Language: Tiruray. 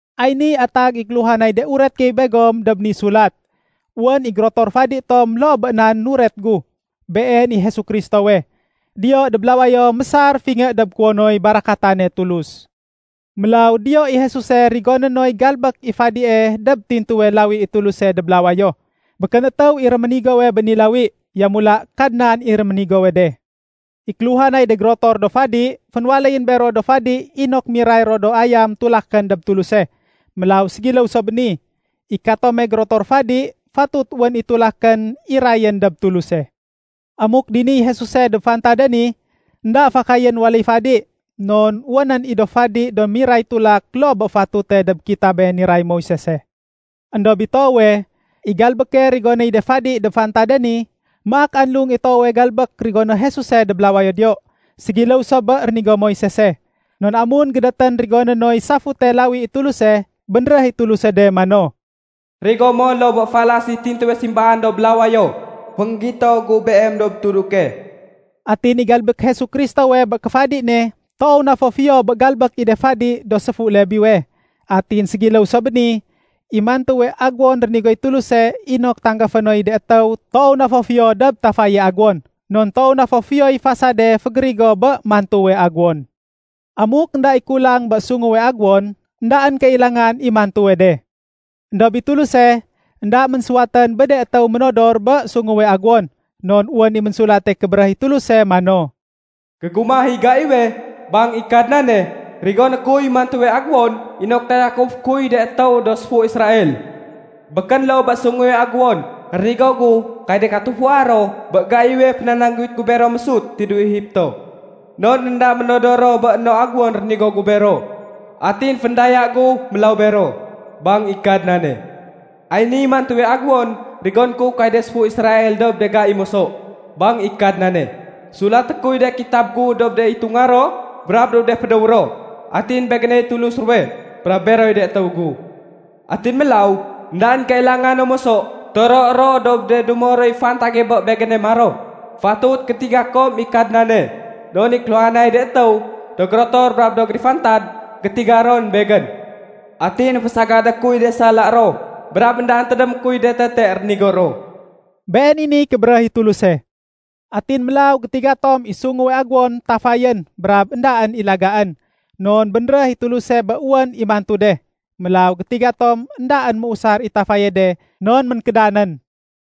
Ay niy atag i kéluhanay de uret gey begom dob ni sulat. Wén i gérotor fadi tom loo bé nan nuret gu, Been i Jesu Kristowe. Diyo dob lawayo mésar fingé dob kuwonoy barakatane Tulus. Mélaw diyo i Jesuse rigoné noy galbék i fadie dob tintuwe lawi i Tuluse dob lawayo. Békén étéw i réménigowe bé ni lawi, yamula Kadnan i réménigowe de. I kéluhanay de gérotor do fadi, fénwaléyén bero do fadi inok miray ro do ayam tulakén dob Tuluse. Mélaw ségiléw so bé ni, i katome gérotor fadi, fatut wén i tulakén irayén dob Tuluse. Amuk diniy Jesuse dob fantade ni, énda fakayén waléy fadi. Non wénén i do fadi do miray tulak loo bé fatute dob kitabe niray Moisese. Endob i toowe, i galbéke rigonéy de fadi dob fantade ni, maak anlung i toowe galbék rigoné Jesuse dob lawayo diyo. Ségiléw so bé rénigo Moisese. Non amun gédétén rigoné noy safute lawi i Tuluse, bénréh i Tuluse de mano, “Rigo mo loo bé falas i tintuwe simbaan dob lawayo fénggito gu beem dob tuduke.” Atin i galbék Jesu Kristowe bé kéfadi ne toow na fo fiyo bé galbék i de fadi do séfu Lebiwe. Atin ségiléw so bé ni, i mantuwe aguwon rénigoy Tuluse inok tanggafé noy de étéw toow na fo fiyo dob tafaye aguwon. Non toow na fo fiyoy fasade fégérigo bé mantuwe aguwon. Amuk énda i kulang bé sunguwe aguwon, éndaén kailangan i mantuwe de. Endob i Tuluse énda ménsuwatén bé de étéw modor bé sunguwe aguwon. Non wén i Ménsulate Kébéréh i Tuluse mano, “Gégumah i gaiwe, bang i Kadnane, rigoné kuy mantuwe aguwon inok tayakufé kuy de étéw do séfu Israel. Békén loo bé sunguwe aguwon rénigo gu kay de katufua ro bé gaiwe fénanangguwit gu bero mésut tidéw Egipto. Non énda ménodor ro bé no aguwon rénigo gu bero. Atin féndaya gu mélaw bero, bang i Kadnane. Ay niy mantuwe aguwon rigoné ku kay de séfu Israel dob de gai moso, bang i Kadnane: Sulaté kuy de kitab gu dob de itunga ro brab dob de fédéw ro. Atin Begéney Tulus ruwe, brab beroy de étéw gu. Atin mélaw, éndaén kailanga no moso toroé ro dob de dumo roy fantage bé Begéne maro, ‘Fatut gétiga kom i Kadnane.’ Non i kéluhanay de étéw, do gérotor brab do gérifantad, gétiga ron Begén. Atin fésagadé kuy de sala ro, brab éndaén tédémé kuy de tete rénigo ro.” Been i niy kébéréh i Tuluse. Atin mélaw gétiga tom i sunguwe aguwon tafayén brab éndaén i lagaén, non bénréh i Tuluse bé wén i mantu de. Mélaw gétiga tom éndaén méusar i tafaye de non ménkédanén.